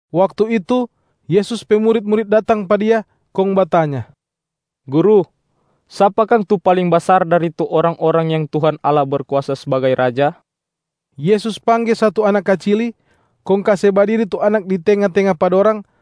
Waktu itu, Yesus pe murit-murit datang pa Dia, kong batanya, “Guru, sapa kang tu paling basar dari tu orang-orang yang Tuhan Allah berkuasa sbagai Raja?” Yesus pangge satu anak kacili, kong kase badiri tu anak di tenga-tenga pa dorang,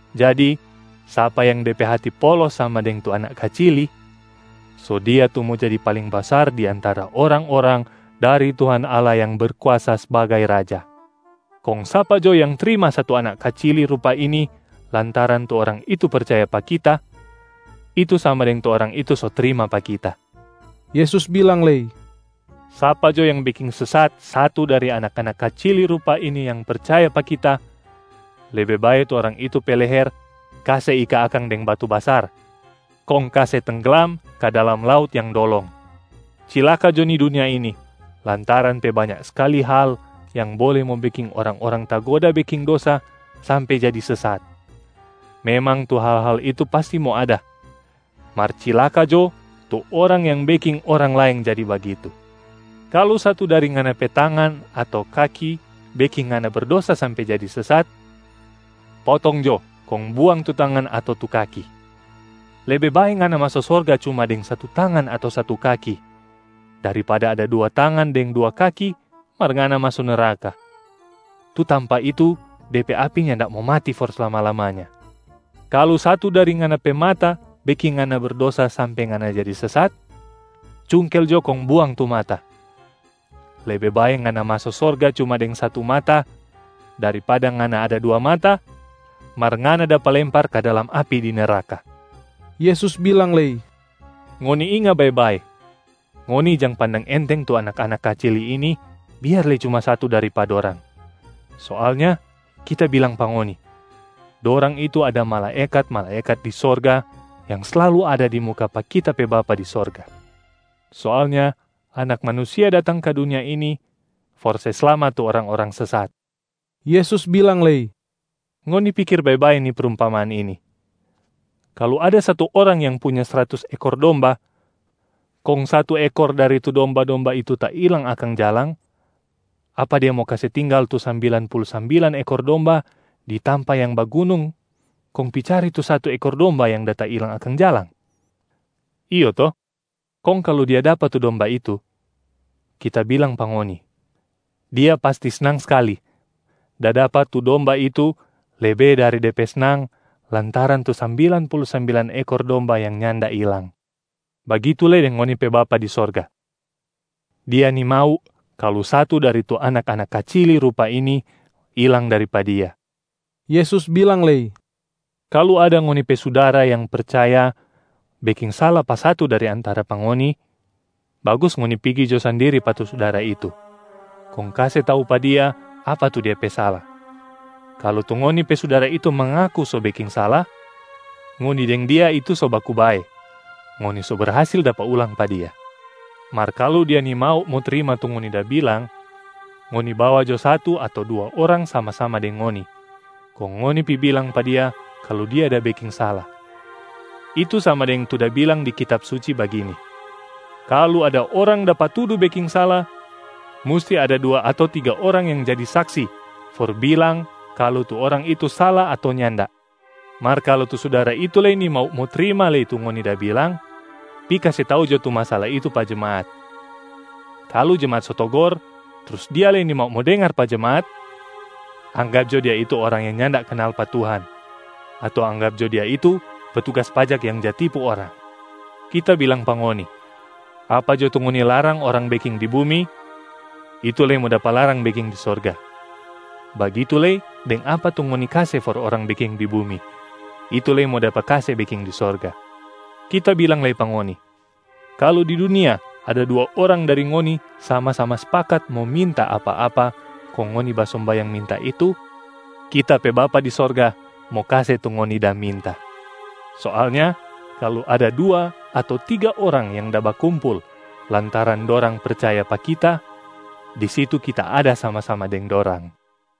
Jadi sapa yang de pe hati polos sama deng tu anak kacili, so dia tu mo jadi paling basar di antara orang-orang dari Tuhan Allah yang Berkuasa sbagai Raja. Kong sapa jo yang trima satu anak kacili rupa ini lantaran tu orang itu percaya pa Kita, itu sama deng tu orang itu so trima pa Kita.” Yesus bilang lei, “Sapa jo yang beking sesat satu dari anak-anak kacili rupa ini yang percaya pa Kita, lebe bae tu orang itu pe leher kase ika akang deng batu basar kong kase tengglam ka dalam laut yang dolong. Cilaka jo ni dunia ini lantaran pe banya skali hal yang bole mo beking orang-orang tagoda beking dosa sampe jadi sesat. Memang tu hal-hal itu pasti mo ada, mar cilaka jo tu orang yang beking orang laeng jadi bagitu! Kalu satu dari ngana pe tangan ato kaki beking ngana berdosa sampe jadi sesat, potong jo kong buang tu tangan ato tu kaki! Lebe bae ngana maso sorga cuma deng satu tangan ato satu kaki, daripada ada dua tangan deng dua kaki mar ngana maso neraka. Tu tampa itu de pe api nyanda mo mati for slama-lamanya. Kalu satu dari ngana pe mata beking ngana berdosa sampe ngana jadi sesat, cungkel jo kong buang tu mata! Lebe bae ngana maso sorga cuma deng satu mata, daripada ngana ada dua mata mar ngana dapa lempar ka dalam api di neraka.” Yesus bilang lei, “Ngoni inga bae-bae, ngoni jang pandang enteng tu anak-anak kacili ini biar lei cuma satu dari pa dorang. Soalnya Kita bilang pa ngoni, dorang itu ada malaekat-malaekat di sorga yang slalu ada di muka pa Kita pe Bapa di sorga. [ Soalnya Anak Manusia datang ka dunia ini for se slamat tu orang-orang sesat.”] Yesus bilang lei, “Ngoni pikir bae-bae ni prumpamaan ini. Kalu ada satu orang yang punya sratus ekor domba kong satu ekor dari tu domba-domba itu tailang akang jalang, apa dia mo kase tinggal tu sambilan pulu sambilan ekor domba di tampa yang bagunung kong pi cari tu satu ekor domba yang da tailang akang jalang? Iyo to? Kong kalu dia dapa tu domba itu, Kita bilang pa ngoni, dia pasti snang skali da dapa tu domba itu lebe dari de pe snang lantaran tu sambilan pulu sambilan ekor domba yang nyanda ilang. Bagitu lei deng ngoni pe Bapa di sorga, Dia nimau kalu satu dari tu anak-anak kacili rupa ini ilang dari pa Dia.” Yesus bilang lei, “Kalu ada ngoni pe sudara yang percaya beking sala pa satu dari antara pa ngoni, bagus ngoni pigi jo sandiri pa tu sudara itu, kong kase tau pa dia apa tu dia pe sala. Kalu tu ngoni pe sudara itu mangaku so beking sala, ngoni deng dia itu so baku bae, ngoni so berhasil dapa ulang pa dia. Mar kalu dia nimau mo trima tu ngoni da bilang, ngoni bawa jo satu ato dua orang sama-sama deng ngoni, kong ngoni pi bilang pa dia kalu dia da beking sala. Itu sama deng tu da bilang di Kitab Suci bagini, ‘Kalu ada orang dapa tudu beking sala, musti ada dua ato tiga orang yang jadi saksi for bilang kalu tu orang itu sala ato nyanda.’ Mar kalu tu sudara itu lei nimau mo trima lei tu ngoni da bilang, pi kase tau jo tu masala itu pa jemaat. Kalu jemaat so togor, trus dia lei nimau mo dengar pa jemaat, anggap jo dia itu orang yang nyanda kanal pa Tuhan ato anggap jo dia itu petugas pajak yang ja tipu orang. Kita bilang pa ngoni, apa jo tu ngoni larang orang beking di bumi, itu lei mo dapa larang beking di sorga. Bagitu lei deng apa tu ngoni kase for orang beking di bumi, itu lei mo dapa kase beking di sorga. Kita bilang lei pa ngoni, kalu di dunia ada dua orang dari ngoni sama-sama spakat mo minta apa-apa kong ngoni basombayang minta itu, Kita pe Bapa di sorga mo kase tu ngoni da minta. Soalnya kalu ada dua ato tiga orang yang da bakumpul lantaran dorang percaya pa Kita, di situ Kita ada sama-sama deng dorang.”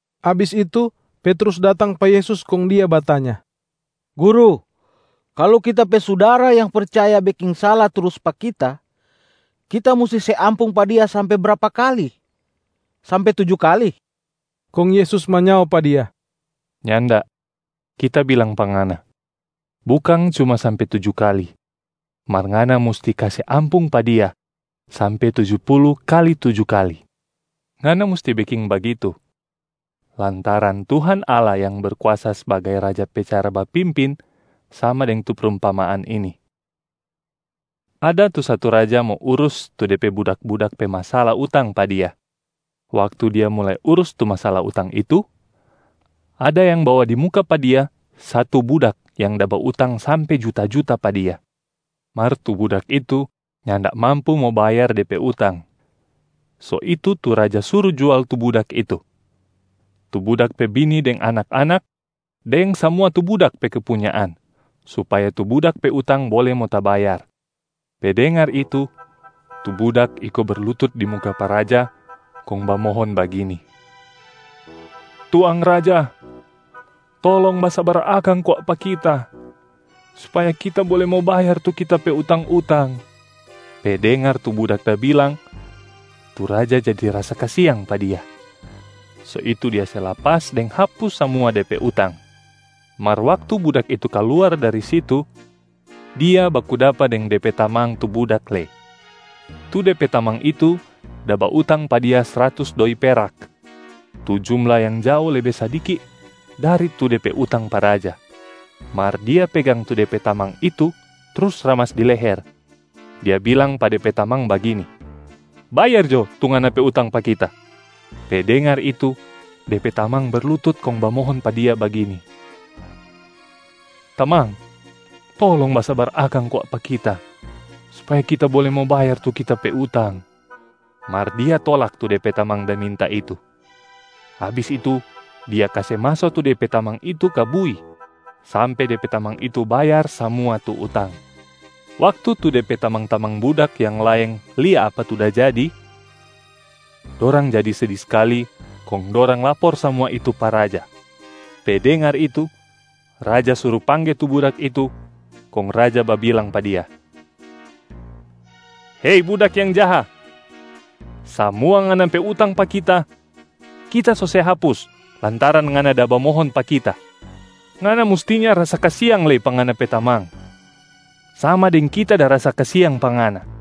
Abis itu Petrus datang pa Yesus kong dia batanya, “Guru, kalu kita pe sudara yang percaya beking sala trus pa kita, kita musti se ampung pa dia sampe brapa kali? Sampe tuju kali?” Kong Yesus manyao pa dia, “Nyanda. Kita bilang pa ngana, bukang cuma sampe tuju kali, mar ngana musti kase ampung pa dia sampe tuju pulu kali tuju kali. Ngana musti beking bagitu, lantaran Tuhan Allah yang Berkuasa sbagai Raja pe cara bapimpin sama deng tu prumpamaan ini: ada tu satu raja mo urus tu de pe budak-budak pe masala utang pa dia. Waktu dia mulai urus tu masala utang itu, ada yang bawa di muka pa dia satu budak yang da bautang sampe juta-juta pa dia. Mar tu budak itu nyanda mampu mo bayar de pe utang. So itu tu raja suru jual tu budak itu, tu budak pe bini deng anak-anak, deng samua tu budak pe kepunyaan supaya tu budak pe utang bole mo tabayar. Pe dengar itu, tu budak iko berlutut di muka pa raja kong bamohon bagini, ‘Tuang raja, tolong basabar akang kwa pa kita supaya kita bole mo bayar tu kita pe utang-utang.’ Pe dengar tu budak da bilang, tu raja jadi rasa kasiang pa dia so itu dia se lapas deng hapus samua de pe utang. Mar waktu budak itu kaluar dari situ, dia baku dapa deng de pe tamang tu budak lei. Tu de pe tamang itu da bautang pa dia sratus doi perak, tu jumla yang jao lebe sadiki dari tu de pe utang pa raja. Mar dia pegang tu de pe tamang itu trus ramas di leher, dia bilang pa de pe tamang bagini, ‘Bayar jo tu ngana pe utang pa kita!’ Pe dengar itu, de pe tamang berlutut kong bamohon pa dia bagini, ‘Tamang, tolong basabar akang kwa pa kita supaya kita bole mo bayar tu kita pe utang.’ Mar dia tolak tu de pe tamang da minta itu. Abis itu dia kase maso tu de pe tamang itu ka bui sampe de pe tamang itu bayar samua tu utang. Waktu tu de pe tamang-tamang budak yang laeng lia apa tu da jadi, dorang jadi sedi skali kong dorang lapor samua itu pa raja. Pe dengar itu, raja suru pangge tu budak itu kong raja babilang pa dia, ‘Hei budak yang jaha! Samua ngana pe utang pa kita, kita so se hapus lantaran ngana da bamohon pa kita. Ngana mustinya rasa kasiang lei pa ngana pe tamang, sama deng kita da rasa kasiang pa ngana.’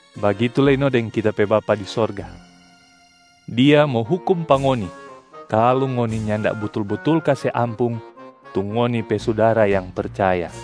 Bagitu lei no deng Kita pe Bapa di sorga, Dia mo hukum pa ngoni kalu ngoni nyanda butul-butul kase ampung tu ngoni pe sudara yang percaya.”